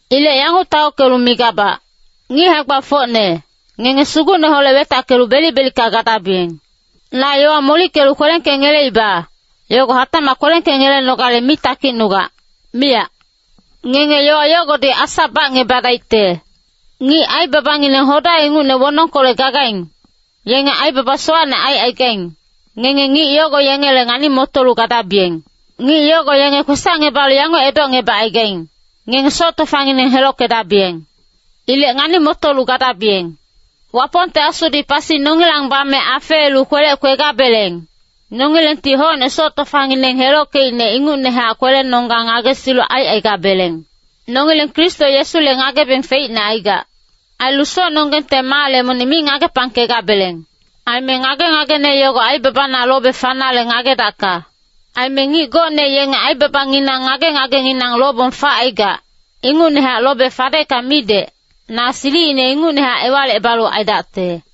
Ilec yanguc taockelu migabac, ngic hae-gbafocne, ngenge Sugucneholec wetackelu belic-belicka gadabiyeng. Na yowa molickelu kwelengkengeleiba, yogo hatacmac kwelengkengelenogale mi takicnugac, miyac. Ngenge yowa yogodi asa bacngebadaicte. Ngic aibabangineng hoda ingucne wonongkolec gagaing, yenge aibaba sowacne aicaigaing, ngenge ngic yogo yengele ngani-motolu gadabiyeng. Ngic yogo yenge kwesacngebalu yanguc edocngebacaigaing, “Ngenge soc tofangineng helockedabiyeng.” Ilec ngani-motolu gadabiyeng. Wapongte Asudi pasi nongilang bame afeelu kwelec kwegabeleng, nongilengti hocne soc tofangineng helockeicne ingucnehac kwelenonggang ngagesilu aicaigabeleng. Nongileng Kristo Yesule ngagebeng feicne aigac. Ailu socnonggengte maale monic mi ngagepangkegabeleng. Aime ngage-ngagene yogo aibabana lobe fanale ngagedacka. Aime ngic gocne yenge aibabanginang ngage-ngagengineng lobong facaigac, ingucnehac lobe fadecka midec, na silicine ingucnehac ewalicebalu aidacte.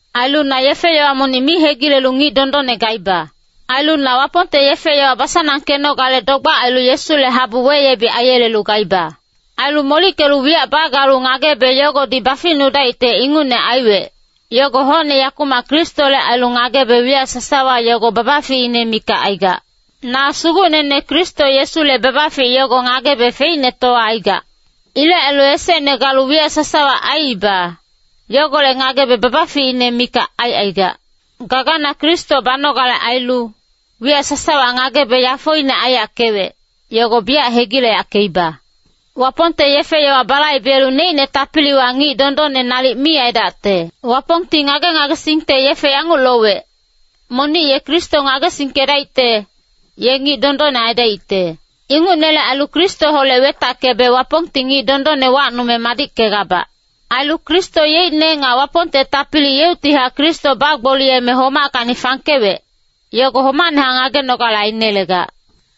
Ailu na yefe-yowa monic mi hegilelu ngic dondonne gaiba. Ailu na Wapongte yefe-yowa basanangkenogale dogbac ailu Yesule habu weyebic aiyelelu gaiba. Ailu molickelu wiyac bagalu ngagebe yogodi baficnudaicte ingucne aiwec, yogo hocne yakumac Kristole ailu ngagebe wiyac sasawa yogo babaficine mikac aigac. Na Sugucnene Kristo Yesule babafic yogo ngagebe feicnetowa aigac. Ilec ailu esecne galu wiyac sasawa aiiba, yogolec ngagebe babaficine mikac aicaigac. Gagana Kristo banogale ailu, wiyac sasawa ngagebe yafoine aiyackewec, yogo biyac hegileyackeiba. Wapongte yefe-yowa balaibelu neicne tapiliwa ngic dondonne nalic mi aidacte. Wapongti ngage-ngagesingte yefe yanguc lowec, monic ye Kristo ngagesingkedaicte, ye ngic dondonne aidaicte. Ingucnele ailu Kristoholec wetackebe Wapongti ngic dondonne wacnume madickegabac. Ailu Kristo yeicne nga Wapongte tapili yeuctihac Kristo bagboliyeme homackacni fangkewec, yogo homacnehac ngagenogale ainelegac.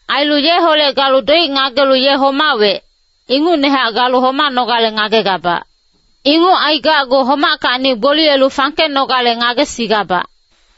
Ailu yeholec galu doic ngagelu ye homawec, ingucnehac galu homanogale ngagegabac. Inguc aigacgu homackacni gboliyelu fangkenogale ngagesigabac.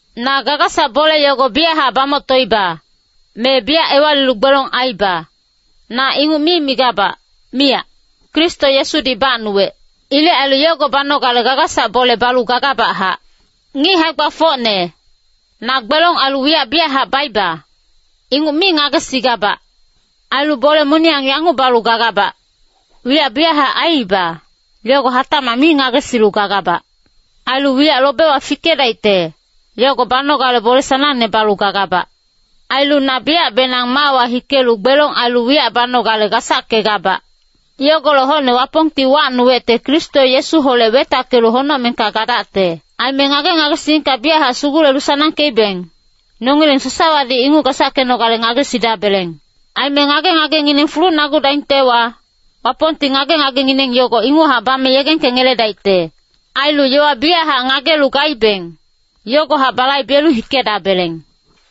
Na gagasac bole yogo biyachac bamoctoiba, me biyac ewalilu gbelong aiiba, na inguc mi migabac, miyac. Kristo Yesudi bacnuwec. Ilec ailu yogo banogale gagasac bole balu gagabachac. Ngic hae-gbafocne, na gbelong ailu wiyac biyachac baiba, inguc mi ngagesigabac. Ailu bole moniyang yanguc balu gagabac, wiyac biyachac aiiba, yogo hatacmac mi ngagesilu gagabac. Ailu wiyac lobewa fikedaicte, yogo banogale bole sanangne balu gagabac. Ailu na biyacbenang maawa hikelu gbelong ailu wiyac banogale gasackegabac. Yogolec hocne Wapongti wacnuwecte Kristo Yesuholec wetackelu honocmengka gadacte. Aime ngage-ngagesingka biyachac sugulelu sanangkeibeng, nongileng sasawadi inguc gasackenogale ngagesidabeleng. Aime ngage-ngagengineng fulucnagudaingtewa, Wapongti ngage-ngagengineng yogo inguchac bame yegengkengeledaicte. Ailu yowa biyachac ngagelu gaibeng, yogohac balaibelu hikedabeleng.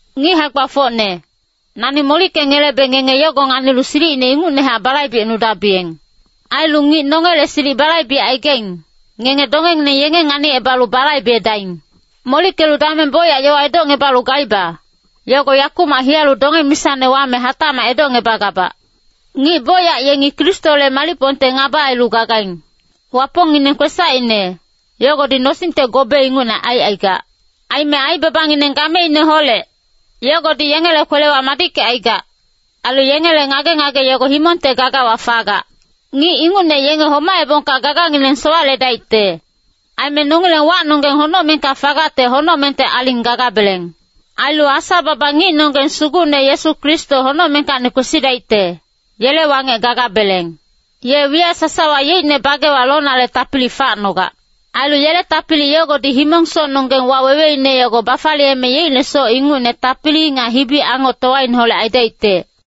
Ngic hae-gbafocne, nani molickengelebe ngenge yogo nganilu silicine ingucnehac balaibecnudabiyeng. Ailu ngic nongele silic balaibecaigaing, ngenge dongengineng yenge nganicebalu balaibedaing. Molickelu dameng bocyac yowa edocngebalu gaiba, yogo yakumac hiyalu donge-misane wame hatacmac edocngebagabac. Ngic bocyac yengi Kristole malicpongte ngaba ailu gagaing. Wapongngineng kwesacine, yogodi nosingte gobe ingucne aicaigac. Aime aibabangineng gameineholec, yogodi yengele kwelewa madickecaigac, ailu yengele ngage-ngage yogo himongte gagawa fagac. Ngic ingucne yenge homaebongka gagangineng sowaledaicte. Aime nongileng wacnonggeng honocmengka fagacte honocmengte aling gagabeleng. Ailu Asa-baba ngicnonggeng Sugucne Yesu Kristo honocmengkacni kwesidaicte, yele wangec gagabeleng. Ye wiyac sasawa yeicne bagewa lonale tapili facnogac. Ailu yele tapili yogodi himong-socnonggeng waweweine yogo bafaliyeme yeicne soc ingucne tapili nga hibi-angoctowaineholec aidaicte.